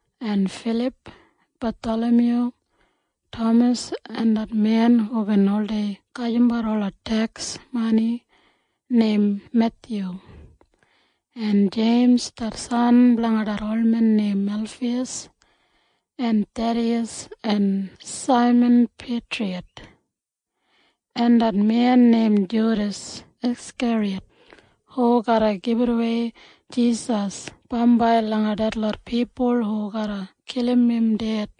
en Filip, Bathalamyu, Tamas en det men hubin oldei gajimbat ola teks mani neim Methyu, en Jeims det san blanga det olmen neim Elfiyas, en Thediyas en Saiman Peitriyat, en det men neim Judas Askeriyat hu garra gibitawei Jisas bambai langa detlot pipul hu garra kilim im ded.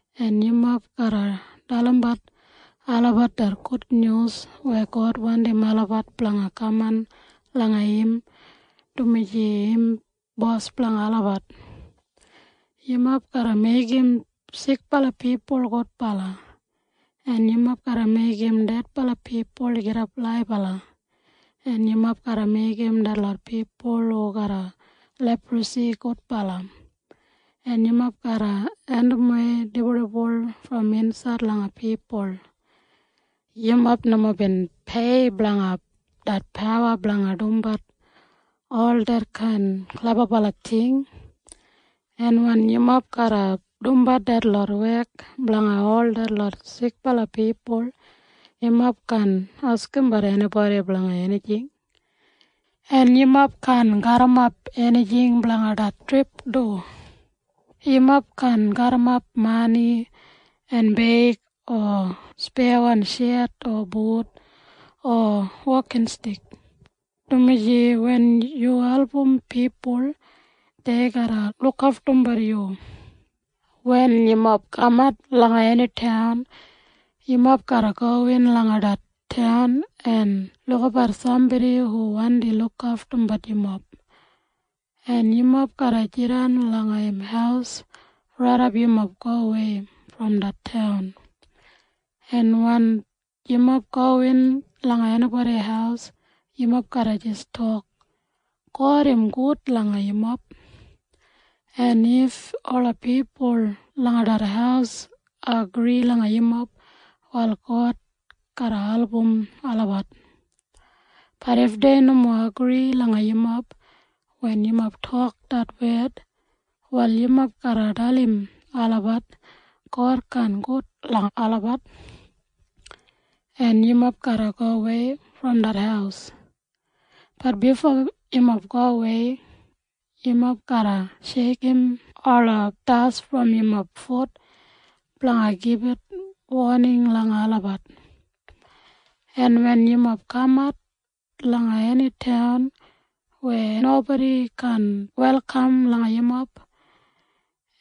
en yumob garra dalimbat olabat det gudnyus weya God wandim olabat blanga kaman langa im dumaji im bos blanga olabat. Yumob garra meigim sikbala pipul gudbala, en yumob garra meigim dedbala pipul gidap laibala, en yumob garra meigim detlot pipul hu garram leprasi gudbala, en yumob garra andimwei dibuldibul brom insaid langa pipul. Yumob nomo bin pei blanga det pawa blanga dumbat ol detkain klebabala ting, en wen yumob garra dumbat detlot wek blanga ol detlot sikbala pipul, yumob kaan askimbat enibodi blanga enijing. En yumob kaan garrimapbat enijing blanga det trip du. Yumob kaan garrimapbat mani en beig o speyawan shet o but o wokinstik, dumaji wen yu albumbat pipul, dei garra lukaftumbat yu. “Wen yumob kamat langa eni taun, yumob garra gowin langa det taun en lukabat sambodi hu wandi lukaftumbat yumob, en yumob garra jidan langa im haus raidap yumob gowei brom det taun, en wen yumob gowin langa enibodi haus, yumob garra jis tok, ‘God im gud langa yumob.’ En if ola pipul langa det haus agri langa yumob, wal God garra album olabat. Bat if dei nomo agri langa yumob wen yumob tok det wed, wal yumob garra dalim olabat God kaan gud langa olabat, en yumob garra gowei brom det haus. Bat bifo yumob gowei, yumob garra sheikim ola das brom yumob fut blanga gibit woning langa olabat. En wen yumob kamat langa eni taun weya nobodi kaan welkam langa yumob,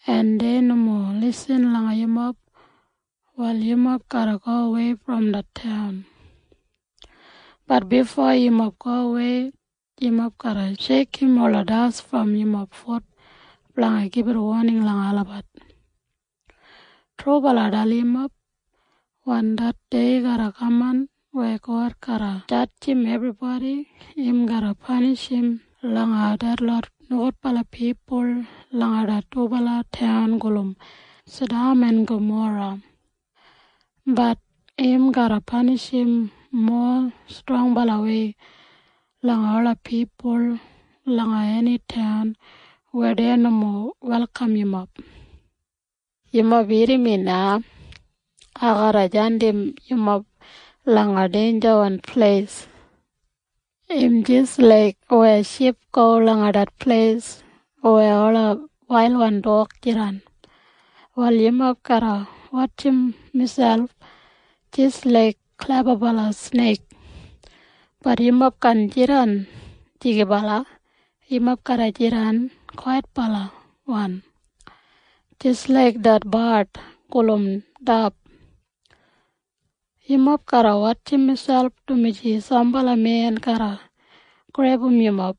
en dei nomo lisin langa yumob, wal yumob garra gowei brom det taun. Bat bifo yumob gowei, yumob garra sheikim ola das brom yumob fut blanga gibit woning langa olabat. Trubala ai dalim yumob. Wen det dei garra kaman weya God garra jadjim ebribodi, im garra panishim langa detlot nogudbala pipul langa det dubala taun gulum Sadam en Gamora. Bat im garra panishim mowa strongbalawei langa ola pipul langa eni taun weya dei nomo welkam yumob. “Yumob irrim mi na. Ai garra jandim yumob langa deinjawan pleis. Im jis laik weya ship go langa det pleis weya ola wailwan dog jidan. Wal yumob garra wotjim miselp jis laiga klebabala sneik. Bat yumob kaan jidan jigibala. Yumob garra jidan kwaitbalawan jis laik det bard gulum dab. Yumob garra wotjim miselp, dumaji sambala men garra grebum yumob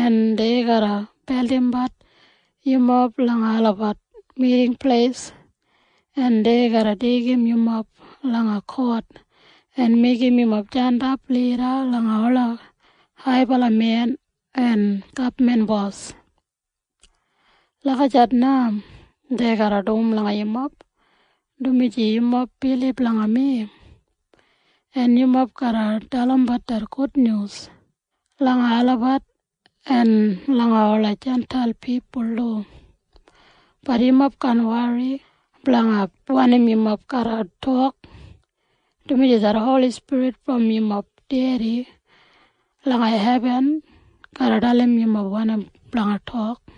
en dei garra beldimbat yumob langa olabat miting pleis, en dei garra deigim yumob langa kot en meigim yumob jandap lida langa ola haibala men en gabman bos. Lagijat na dei garra dum langa yumob, dumaji yumob bilib langa mi. En yumob garra dalimbat det gudnyus langa olabat en langa ola Jintail pipul du. Bat yumob kaan wori blanga wanim yumob garra tok, dumaji det Holi Spirit brom yumob Dedi langa hebin garra dalim yumob wanim blanga tok.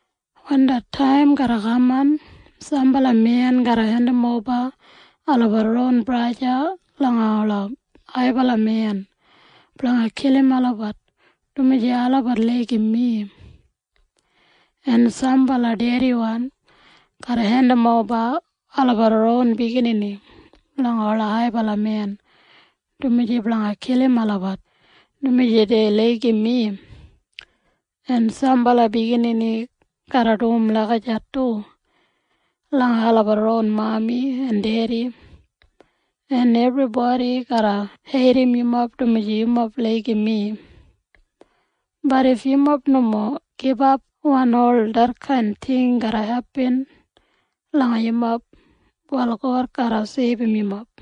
“Wen det taim garra kaman, sambala men garra hendimoba olabat ron braja langa ola haibala men blanga kilim olabat dumaji olabat laigim mi, en sambala dediwan garra hendimoba olabat ron biginini langa ola haibala men du blanga kilim olabat dumaji dei laigim mi, en sambala biginini garra dum lagijat du langa olabat ron mami en dedi, en ebribodi garra heidim yumob dumaji yumob laigim mi. Bat if yumob nomo gibap wen ol detkain ting garra hepin langa yumob, wal God garra seibum yumob.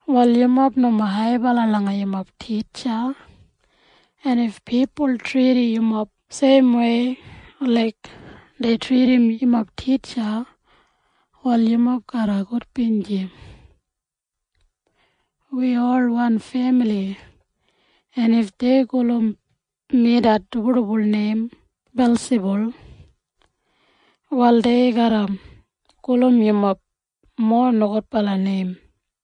Wal yumob nomo haibala langa yumob titja, en if pipul tridim yumob seimwei laik dei tridim yumob titja, wal yumob garra gudbinji. Wi ol wan femili, en if dei gulum mi det dibuldibul neim Belsibul, wal dei garra gulum yumob mowa nogudbala neim.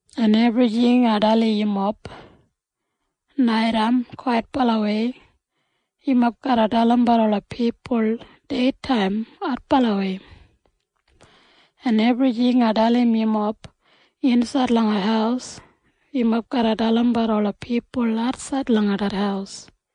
en ebrijing ai dalim yumob naitaim kwaitbalawei, yumob garra dalimbat ola pipul deitaim adbalawei. En ebrijing ai dalim yumob insaid langa haus, yumob garra dalimbat ola pipul atsaid langa det haus.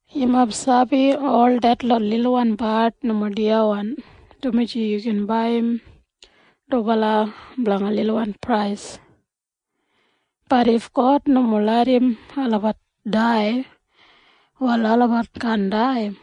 “Yumob sabi ol detlot lilwan bard nomo diyawan dumaji yumob gin baiyim dubala blanga lilwan prais. Bat if God nomo larram olabat dai, wal olabat kaan dai.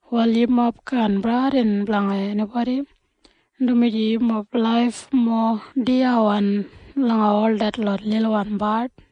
Wal yumob kaan bradin blanga enibodi, dumaji yumob laif mowa diyawan langa ol detlot lilwan bard.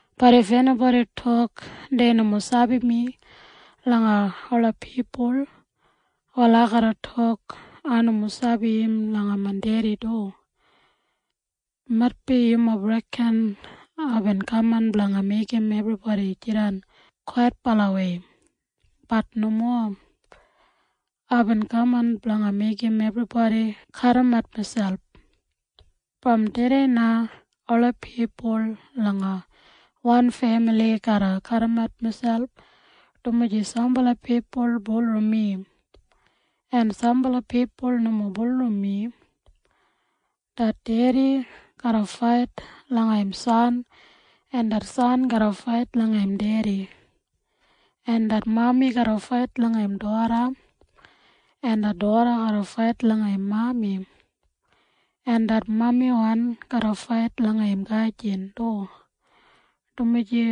Bat if enibodi tok dei nomo sabi mi langa ola pipul, wal ai garra tok ai nomo sabi im langa main Dedi du. “Maitbi yumob reken aibin kaman blanga meigim ebribodi jidan kwaitbalawei. Bat nomo. Aibin kaman blanga meigim ebribodi kadimat miselp. Brom tudei na ola pipul langa wan femili garra kadimat miselp, dumaji sambala pipul bulurrum mi en sambala pipul nomo bulurrum mi. Det dedi garra fait langa im san, en det san garra fait langa im dedi, en det mami garra fait langa im doda, en det doda garra fait langa im mami, en det mamiwan garra fait langa im gajin du, dumaji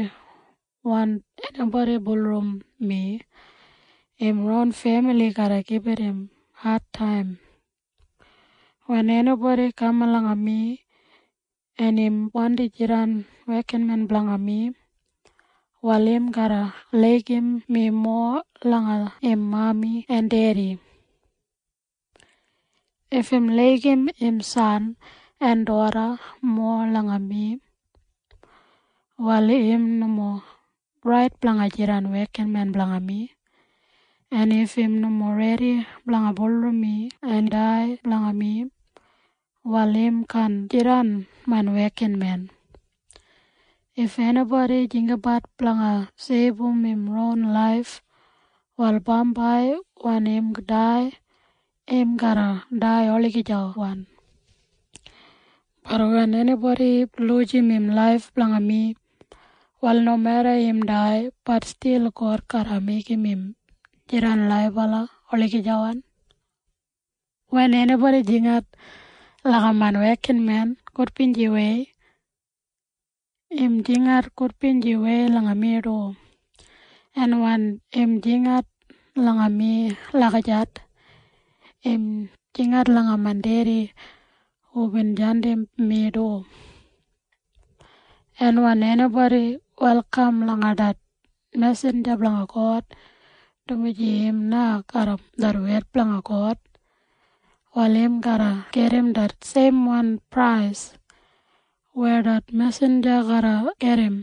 wen enibodi bulurrum mi, im ron femili garra gibit im adtaim. “Wen enibodi kaman langa mi, en im wandi jidan wekinmen blanga mi, wal im garra laigim mi mowa langa im mami en dedi. If im laigim im san en doda mowa langa mi, wal im nomo rait blanga jidan wekinmen blanga mi. En if im nomo redi blanga bulurrum mi en dai blanga mi, wal im kaan jidan main wekinmen. If enibodi jinggabat blanga seibum im ron laif, wal bambai wen im dai, im garra dai olagijawan. Bat wen enibodi lujim im laif blanga mi, wal nomeda im dai, bat stil God garra meigim im jidan laibala olagijawan. “Wen enibodi jingat langa main wekinmen gudbinjiwei, im jingat gudbinjiwei langa mi du. En wen im jingat langa mi lagijat, im jingat langa main Dedi hubin jandim mi du. En wen enibodi welkam langa det mesinja blanga God dumaji im na garram det wed blanga God, wal im garra gedim det seimwan prais weya det mesinja garra gedim.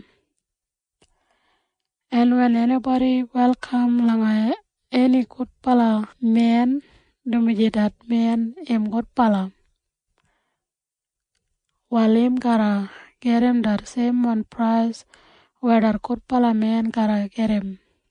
En wen enibodi welkam langa eni gudbala men dumaji det men im gudbala, wal im garra gedim det seimwan prais weya det gudbala men garra gedim.